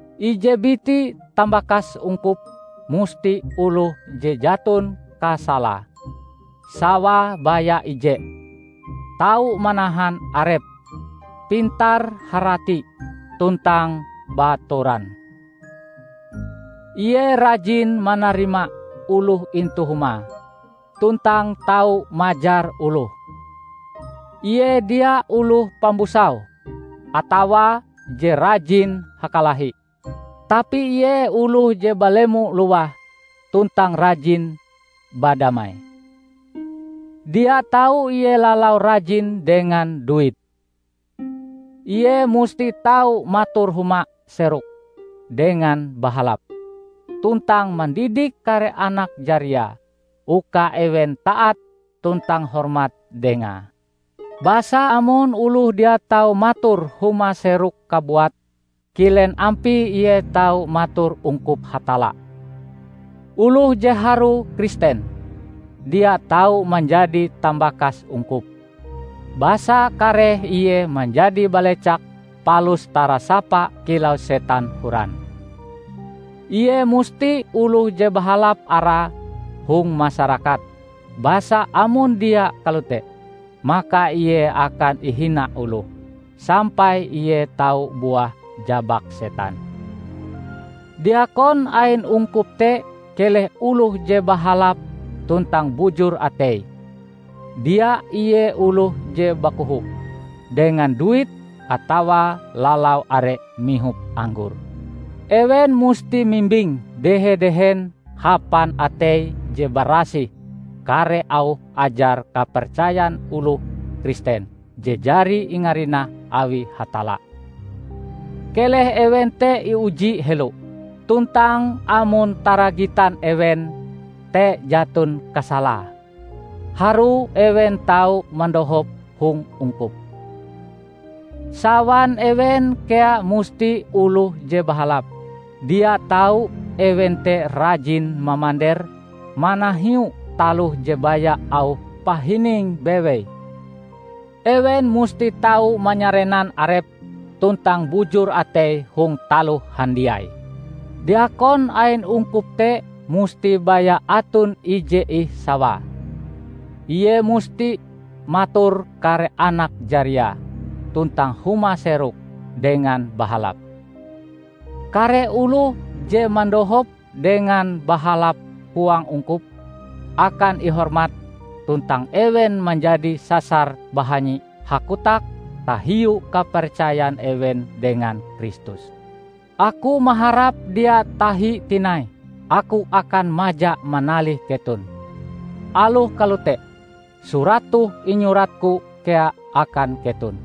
Ije biti tambakas ungkup musti oloh je jaton kasalae, sawae baya ije, tau manahan arepe, pintar-harati, tuntang baatoran; ie rajin manarima oloh intu humae, tuntang tau majar oloh; ie dia oloh pambusau, atawa je rajin hakalahi. Tapi ie oloh je balemo lowah tuntang rajin badamai. Dia tau ie lalau rajin dengan duit. Ie musti tau mator huma seroke dengan bahalap, tuntang mandidik kare anak jariae uka ewen taat tuntang hormat dengae. Basa amon oloh dia tau mator huma seroke kabuat, kilen ampie ie tau mator ungkup Hatalla? Oloh je harue Kristen, dia tau manjadi tambakas ungkup, basa kareh ie manjadi balecak palus tarasapa kilau setan horan. Ie musti oloh je bahalap arae hong masarakat; basa amon dia kalote, maka ie akan ihina oloh, sampai ie tau buah jabak setan. Diakon ain ungkup te keleh oloh je bahalap tuntang bujur ateie; dia ie oloh je bakoho dengan duit atawa lalau are mihop anggor. Ewen musti mimbing dehe-dehen hapan atei je barasih kare auh ajar kapercayan oloh Kristen je jari ingarinah awi Hatalla. Keleh ewen te iuji helo, tuntang amon taragitan ewen te jaton kasalae, harue ewen tau mandohop hong ungkup. Sawan ewen kea musti oloh je bahalap, dia tau ewen te rajin mamander manahiu taloh je baya auh pahining bewei. Ewen musti tau manyarenan arepe tuntang bujur ateie hong taloh handiai. Diakon ain ungkup te musti baya aton ije ih sawae. Ie musti mator kare anak jariae tuntang huma seroke dengan bahalap. Kare oloh je mandohop dengan bahalap huang ungkup, akan ihormat tuntang ewen manjadi sasar bahanyi hakotak tahiu kapercayan ewen dengan Kristus. Aku maharap dia tahi tinai aku akan maja manalih keton. Aloh kalote, surat toh inyuratku kea akan keton,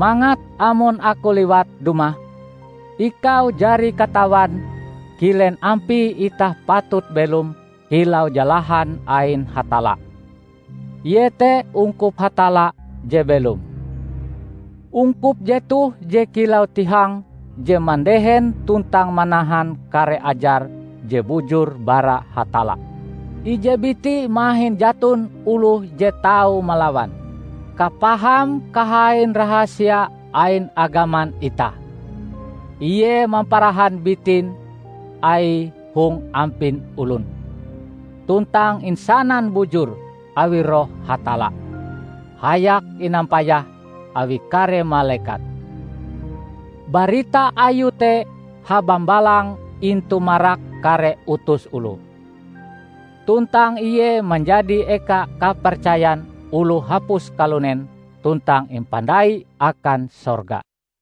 mangat amon aku liwat dumah, ikau jari katawan kilen ampie itah patut belom kilau jalahan ain Hatalla, iete ungkup Hatalla je belom. Ungkup jetoh je kilau tihang je mandehen tuntang manahan kare ajar je bujur bara Hatalla. Ije biti mahin jaton oloh je tau malawan, kapaham kahain rahasia ain agaman itah: Ie mamparahan bitin Aie hong ampin olon, tuntang insanan bujur awi Roh Hatalla, hayak inampayah awi kare malekat. Barita Ayue te habambalang intu marak kare utus oloh. tuntang Ie manjadi eka kapercayan oloh hapus kalunen tuntang impandai akan sorga.